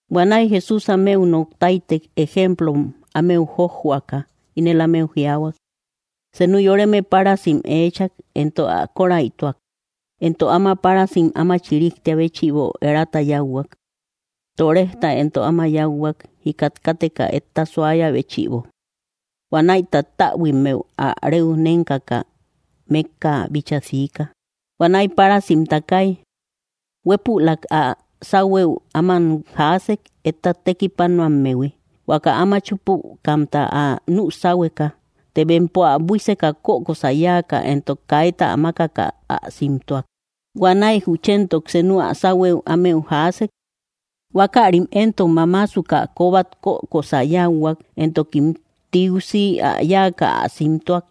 Huanäi Jesús ámeu noktáitek ejemplom ámeu jójjoaka, inel ámeu jiaahuak: —Senu yoreme párasim eechak, éntok ä kóräituak, éntok áma párasim áma chiríjtia béchïbo erata yauhuak. Torejta éntok áma yáuhuak, jikat káteka etta suáyä béchïbo. ’Huanäi tattäbuimmeu ä reu nénkaka mékka bíchaa siika. Huanäi párasim takai, huépülak ä sáuhuëu áman jaasek etta tekipánoammehui, huaka áma chúpukamta ä nüsáuhueka. Të bempo ä buíseka, kökosä yáakä éntok kayta ä makaka ä simtúak. Huanäi juchéntok senuk ä sáuhuëu ámeu jaasek. Huákärim éntok mamáasukä kóbat kökosä yáuhuak, éntokim tiusi ä yáakä ä simtúak.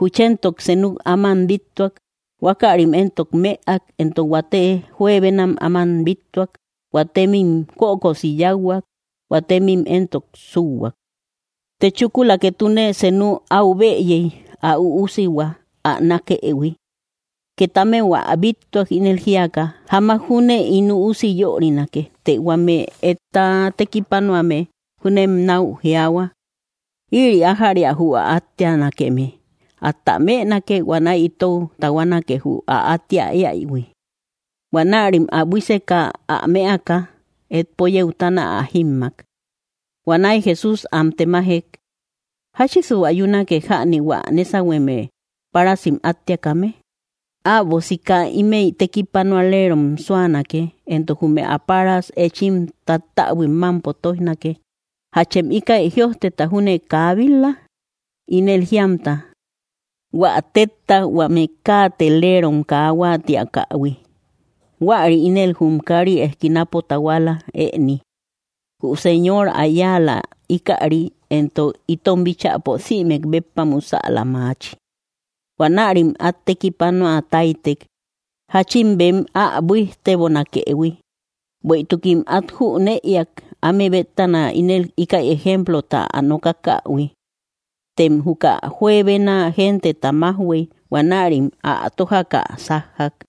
Juchéntok senuk áman bíttuak, huákärim éntok mëak; éntok huate juebenam áman bíttuak, huatémim kökosi yáuhuak, huatémim éntok súhuak. ’Të chúkula, ketune senu au bëyei, ä üúsihua ä nákëhui. Ket ámeu ä bíttuak ínel jíaka: “Jamak júnem ín üusi yörinake.” Të huame etta tekipánoame júnen nau jiaahua: “Ïri ájäria jü ä átteanakeme, átä mënake, huanäi itou tahuánake jü ä attea éaïhui.” Huanärim ä buíseka, ä mëaka, etpo yeutana ä jímmak. Huanäi Jesús am temajek: —¿Jáchisu ayúnake jäni hua nésahueme, párasim átteakame? Äbo sika, ímëi tekipanualeerom súanake, éntok jume ä páras échim tattäbuim mampo tóijnake. ’¿Jáchem íkäi jïojteta júne kaa bit-la? Ínel jíamta: Huä tetta huame káateleerom kaa huáatiakähui, huäri ínel jum kari eskinapo tahuala ëni. Jü Señor ä yáala íkäri, éntok itom bíchäpo sïmek béppa musäla maachi. Huanärim at tekipanuatáitek jachin bem ä buíjtebonakëhui, bueïtukim at jüneïak áme bétana ínel íkäi ejemplota ä nokákähui. Tem juka juebena genteta majhuëi, huanärim ä tójakä sájjak.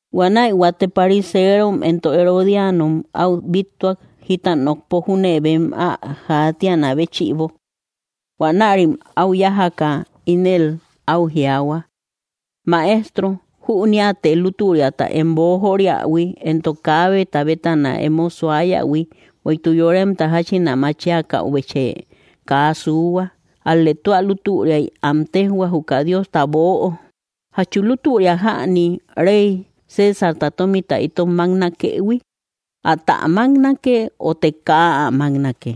Huanäi huate pariseerom éntok Herodíanom au bíttuak jita nokpo júne bem ä jaatíanakë béchïbo. Huanärim au yájaka, ínel au jiaahua: —Maestro, jünéate lútüriata em boojóoriahui, éntok kaabeta bétana emo suáyähui, bueïtuk yoremta jachin ä machíakäubechë kaa suuhua, ál‑lë tua lútüriai am téjhua juka Diosta böo. ¿Jachu lútüria jäni rey Césarta tómita itom maknakëhui? ¿Ata maknake ote kaa ä máknake?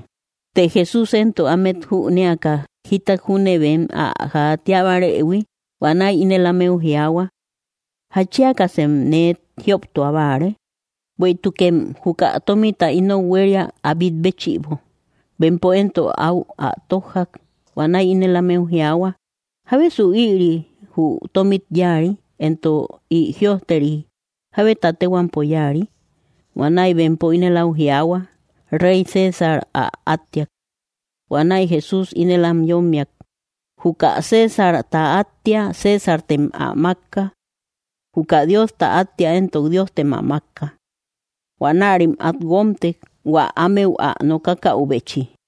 Të Jesús éntok ámet jüneakä jítat júne bem ä jaatíabarëhui, huanäi ínel ámeu jiaahua: —¿Jatchíakasem nee jióptua báare? Bueïtukem juka tómita inou huéria ä bit béchïbo. Bempo éntok au ä tójjak. Huanäi ínel ámeu jiaahua: —¿Jábesu ïri jü tómit yáari, éntok ï jïojteri jábeta tehuampo yáari? Huanäi bempo ínel au jiaahua: —Rey César ä átteak. Huanäi Jesús ínel am yommiak: —Juka Césarta áttea Césartem ä mákka. Juka Diosta attea éntok Diostem ä mákka. Huanärim at guómtek hua ámeu ä nokákäubechi.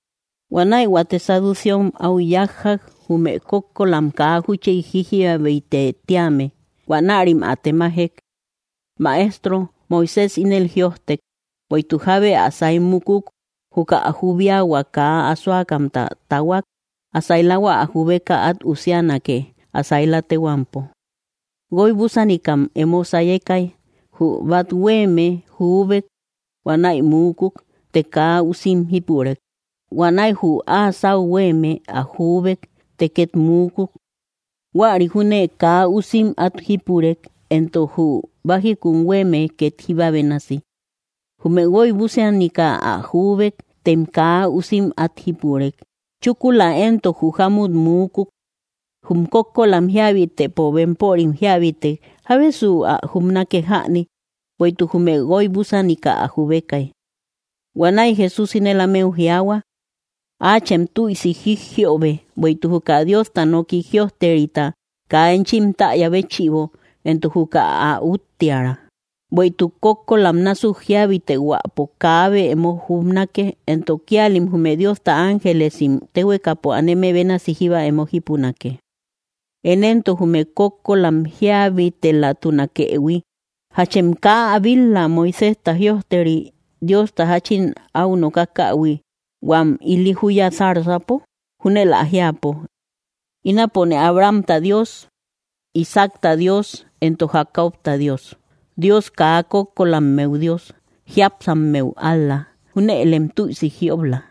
Huanäi huate saducéom au yájjak, jume kókkolam kaa júchi jíjiabitë tíame. Huanärim ä temajek: —Maestro, Moisés ínel jïojtek, bueïtuk jábe ä sai mukuk, juka ä jubíahua kaa asóakamta tahuak, ä sailahua ä jubeka at usianake ä saila tehuampo. Guoibúsanikam emo sayekai. Jü bathuéeme jubek huanäi muúkuk, të kaa usim jípurek. Huanäi jü áa sáu huéeme ä juúbek, të ket muúkuk; huäri júne kaa usim at jípurek. Éntok jü bájikun huéeme ket jíba bénasi. Jume guoibúsanika ä juúbek, tem kaa usim at jípurek. Chúkula éntok jü jámmut muúkuk. Jum kókkolam jíabitëpo, bempörim jíabetek, ¿jábesu ä jubnake jäni, bueïtuk jume guoibúsanika ä jubekai? Huanäi Jesús ínel ámeu jiaahua: —Aachem tuïsi jijjïobe bueïtuk juka Diosta nooki jïojterita kaa enchim taaya béchïbo éntok juka ä úttiära. Bueïtuk kókkolam násuk jíabitehuäpo kaabe emo jubnake, entok kíalim jume Diosta ángelesim téhuekapo aneme bénasi jíba emo jípunake. Én éntok jume kókkolam jíabitelatunakëhui, ¿jachem kaa ä bit‑la Moiséjta jïojteri, Diosta jachin au nokákähui huam ili júya, zarzapo? Júnel ä jiapo: “Ínapone Abrahamta Dios, Isaacta Dios, éntok Jacobta Dios.” Dios kaa kókkolámeu Dios, jíapsámeu ál‑la. Júnëlem tüisi jiób‑la.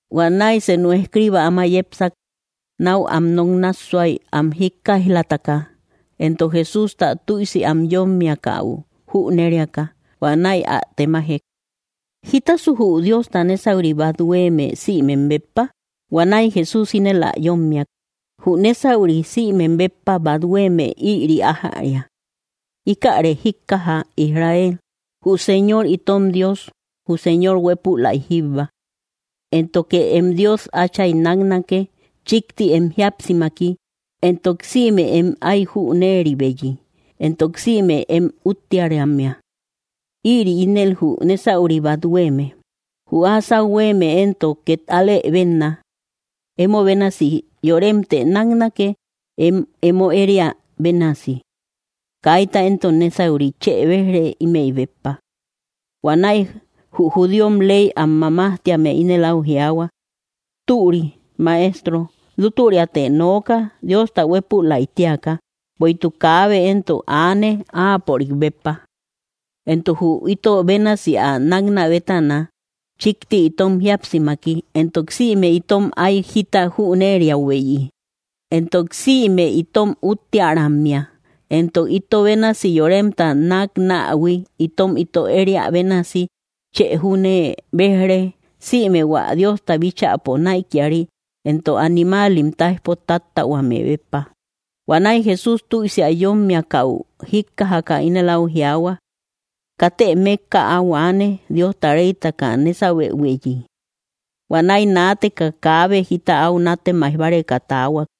Huanäi senu escriba áma yépsak nau am noknássuai am jíkkaijlataka, éntok Jesústa tüisi am yómmiakau jünériaka, huanäi ä temajek: —¿Jítasu jü Diosta nésauri bat huéeme sïmem béppa? Huanäi Jesús ínel ä yommiak: —Jü nésauri sïmem béppa bathuéeme ïri ájäria: “Íkäre jíkkaja Israel, jü Señor itom Dios, jü Señor huépülai jíbba. Éntoke em Dios Átchay náknake chikti em jíapsimaki, éntok sïme em ái jünéribeyi, éntok sïme em úttearammea.” Ïri ínel jü nésauri bathuéeme. Jü áa sáu huéeme éntok ket álë benna: “Emo bénasi yorémtë náknake em emo ériä bénasi.” Kaíta éntok nésauri chë bej‑re ímëi béppa. Huanäi jü judíom ley am mamájtíame ínel au jiaahua: —Türi, Maestro, lútüriate nooka Diosta huépülaitíaka, bueïtuk kaabe éntok aane áapörik béppa. Éntok jü ito bénasi ä náknä bétana chikti itom jíapsimaki, éntok sïme itom ái jita jünériäubeyi, éntok sïme itom úttearammea, éntok ito bénasi yoremta náknähui itom ito ériä bénasi, chë júne bej‑re sïme hua Diosta bíchäpo naïkiari éntok animáalim taijpo tattahuame béppa. Huanäi Jesús tüisi ä yómmiakäu jíkkajaka, ínel au jiaahua: —Katë mékka áu aane Diosta reytaka nésahuebeyhui. Huanäi naateka kábe jita au nátemaij báreka taahuak.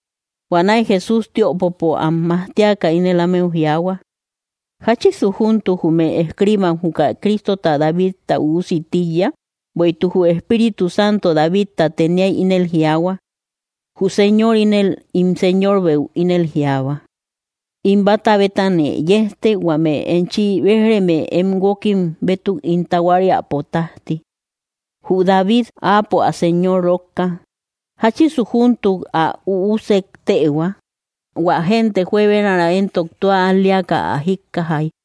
Huanäi Jesús tiöpopo am majtiaka ínel ámeu jiaahua: —¿Jáchisu júntuk jume escribam juka Crístota Davidta üusi tíiya? Bueïtuk jü Espíritu Santo Davidta teniai ínel jiaahua: Jü Señor ínel ín Señorbeu ínel jiaahua: “In bata bétanë yejte, huame enchi béj‑reme em guókkim bétuk ín tahuáriäpo tajti.” Jü David, áapo ä Señor rókka, ¿jáchisu júntuk ä üúsek téehua? Huä gente juebenara éntok tua al‑léakä ä jíkkajai.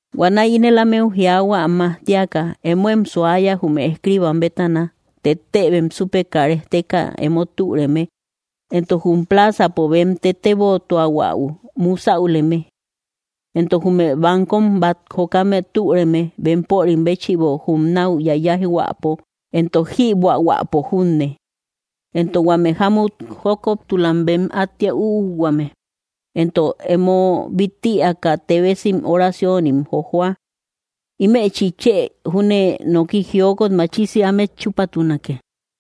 Huanäi ínel ámeu jiaahua am majtíaka: —Émoem suáya jume escribam bétana, téttëbem súpeka rejteka emo türeme, éntok jum plázapo bem tetébotuahuäu musäuleme. Éntok jume baankom bat jokame türeme bempörim béchïbo jum nau yayáijhuäpo, éntok jïbuähuäpo junne; entok huame jámut jókoptulam bem attea üuhuame, entok emo bit‑ïaka téebesim oraciónim jojohua. Ímechi chë júnee noki jiokot machisi ámet chúpatunake.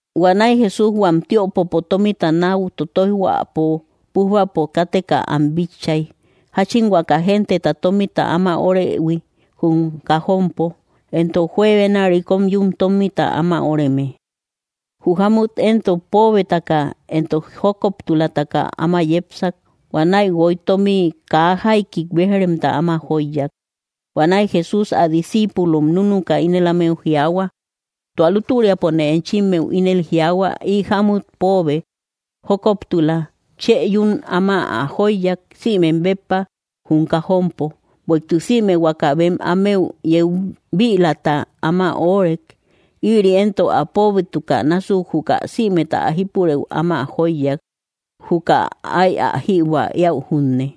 Huanäi Jesús huam tiöpopo tómita nau totoijhuapo pújbapo káteka am bitchay, jachin huaka genteta tómita áma órehui jum kajompo, éntok juebena rikom yún tomita áma óreme. Jü jámmut éntok póobetakä éntok jókoptulatakä áma yépsak. Huanäi guoi tómi kaa jaikik bejremta áma jóiyak. Huanäi Jesús ä discíipulom núnuka, ínel ámeu jiaahua: —Tua lútüriapone enchimmeu ínel jiaahua, ï jámmut póobe jókoptula chë yún áma ä jóiyak sïmem béppa jum kajompo; bueïtuk sïme huaka bem ámeu yeu bïlata áma óorek; ïri éntok ä póobétukä násuk juka sïmeta ä jípurëu áma jóiyak, juka áy ä jïbuä éäu junne.